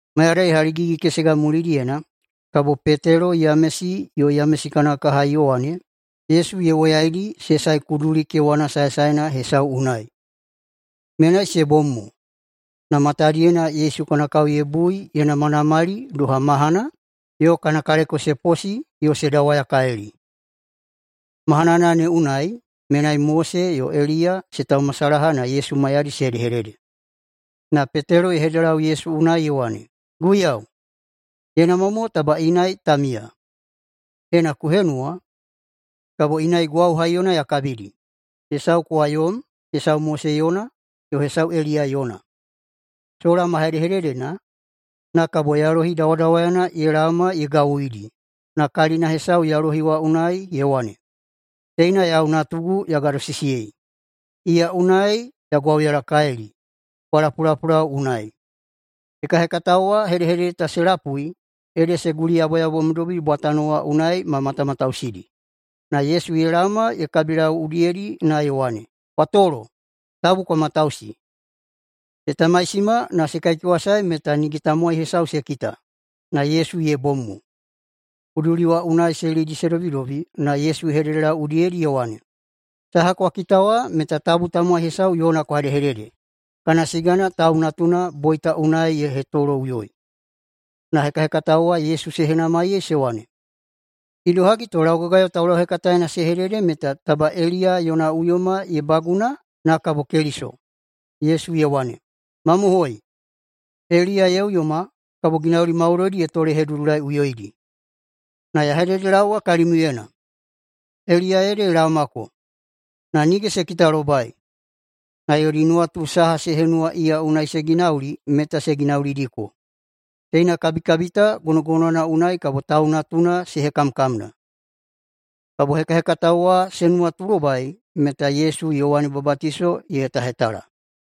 Mayadai haligigi-kesega mulidiyena kabo Petelo, Yamesi, yo Yamesi kana kaha Yowane, Yesu ye woyaidi se sae kuduli kewana saesaena hesau unai. Menai se bom mo, na matadiyena Yesu kana kao ye bui ye namanamali doha mahana yo kana kaleko se posi yo se dawayakalili. Mahanana ne unai menai Mose yo Eliya se taumasalaha na Yesu maiyadi se hedehedede. Na Petelo ye hededelau Yesu unai ye wane, “Guiyau, ye namwa mo taba inai ta miya. Ena ku henuwa, kabo inai gwau haiyona ya kabidi, hesau kowa yom, hesau Mose yona, yo hesau Eliya yona.” Sola ma hedehededena, na kabo yalohi dawadawayana ye laoma ye gawuidi, na kalina hesau yalohi wa unai ye wane, “Teina yau Natugu ya gadosisiyei. Iya unai ya gwauyalakalili. Kwa lapulapulau unai!” Hekahekatao wa hedehedede ta se lapui ede se guliyaboyabomdobi bwatano wa unai ma matamatausidi. Na Yesu ye laoma ye kabilau udiyedi na ye wane, “Kwa tolo. Tabu kwa matausi.” Se tamaisima na se kaikewasae meta nige tamowai hesau se kita, na Yesu ye bom mo. Kuduli wa unai se lidi se dobidobi na Yesu ye hededelau udiyedi ye wane, “Saha kwa kita wa meta tabu tamowai hesau yona kwa hedehedede, kana siga Yaubada Tau Natuna boita unai ye hetoloꞌuyoi.” Na hekahekatao wa Yesu se henamaiyei se wane, “Idohagi to laugagayo taulauhekataena se hedede meta taba bena Eliya yona uyoma ye baguna na kabo Keliso?” Yesu ye wane, “Mamohoi, Eliya ye uyoma kabo ginauli maudoidi ye tolehedudulaiꞌuyoidi. Na ya hededelaowa kalimiuyena: Eliya ede ye laomako, na nige se kitalobai. Na yodi nuwatu saha se henuwa iya unai se ginauli meta se ginaulidiko. Teina kabikabi ta gonogonowana unai kabo Tau Natuna se hekamkamna.” Kabo hekahekatao wa se nuwatulobai meta Yesu Yowane Babatiso ye hetahetala.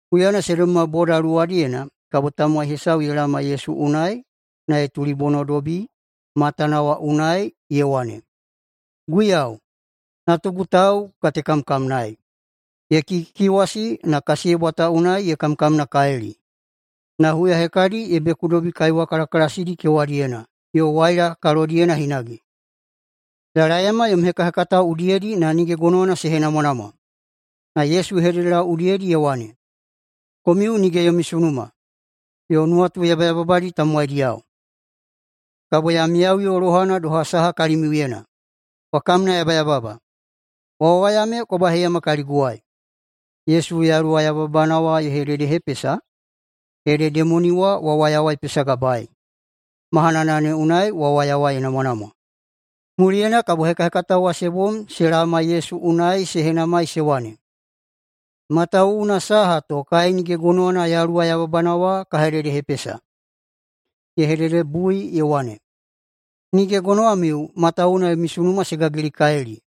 Huyana se dobima boda luwadiyena kabo tamowai hesau ye laoma Yesu unai na ye tulibonodobi matana wa unai ye wane, “Guiyau, natugu tau ku katekamkamnaei. Ye kikikikiwasi, na kasiyebwa ta unai ye kamkamnakalili. Na huya hekadi ye bekudobi kaiwa kalakalasidi kewadiyena yo waila kalodiyena hinage. Ya laeyama yom hekahekatao udiyedi na nige gonowana se henamwanamwa.” Na Yesu ye hededelau udiyedi ye wane, “Komiu nige yomi sunuma, yo nuwatu yabayababadi tamowaidiyao! Kabo ya miyaꞌuyo lohana doha saha kalimiuyena? Kwa kamnayabayababa! Wawaya me kwa baheiyama kaliguwai.” Yesu yaluwa yabayababana wa ye hededehepesa, ede demoni wa wawaya wa ye pesagabaei. Mahanana ne unai wawaya wa ye namwanamwa. Muliyena kabo hekahekatao wa se bom se laoma Yesu unai se henamai se wane, “Matawuwuna saha to kai nige gonowana yaluwa yababana wa ka hededehepesa?” Ye hededebui ye wane, “Nige gonowamiu matawuwuna yomi sunuma se gagilikalili.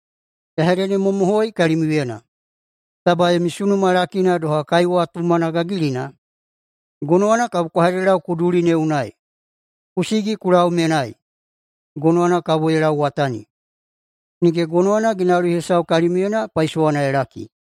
Ya hededemamohoi kalimiuyena: Taba yomi sunuma lakina doha kaiwa tumana gagilina, gonowana kabo kwa hededelau kuduli ne unai, ‘Ku sigi ku lau menai!’, gonowana kabo ye lauwatani. Nige gonowana ginauli hesau kalimiuyena paisowana ye laki.”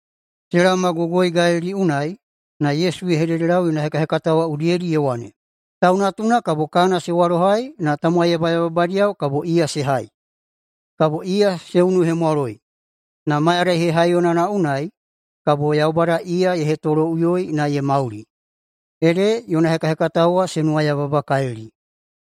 Se laomagogoi Galili unai na Yesu ye hededelau yona hekahekatao udiyedi ye wane, “Tau Natuna kabo kana se walohai na tamowai yabayababadiyao kabo iya se hai. Kabo se unuhemwaloi, na mayadai hehaiyonana unai kabo Yaubada iya ye hetoloꞌuyoi na ye mauli.” Ede yona hekahekatao wa se nuwayababakalili.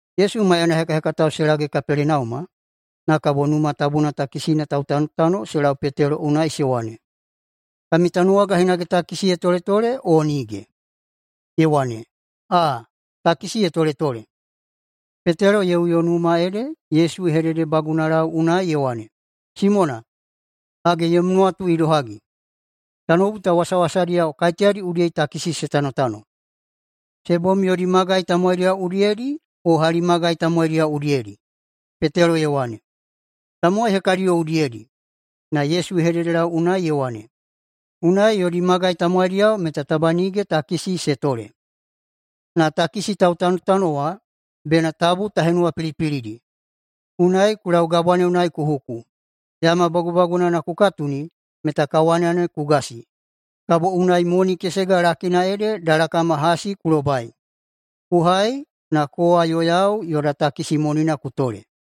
Yesu maiyana hekahekatao se lage Kapelenauma, na kabo Numa Tabuna takisina tautanotano se lau Petelo unai se wane, “Kami tanuwaga hinage takisi ye toletole o nige?” Ye wane, “Aa, takisi ye toletole.” Petelo ye uyo numa ede Yesu ye hededebagunalau unai ye wane, “Simona, hage, yom nuwatu idohagi? Tanoubu ta wasawasadiyao kaiteyadi udiyedi takisi se tanotano? Se bom yodi magai tamowaidiyao udiyedi, o hali magai tamowaidiyao udiyedi?” Petelo ye wane, “Tamowai hekadiyao udiyedi.” Na Yesu ye hededelau unai ye wane, “Unai yodi magai tamowaidiyao meta taba nige takisi se tole. Na takisi tautanotano wa bena tabu ta henuwapilipilidi. Unai ku lau gabwa ne unai ku huku. Yama bagubagunana ku katuni meta kawana ne ku gasi, kabo unai moni kesega lakina ede dalakama hasi ku lobai. Ku hai na kowa yo yau yoda takisi monina ku tole.”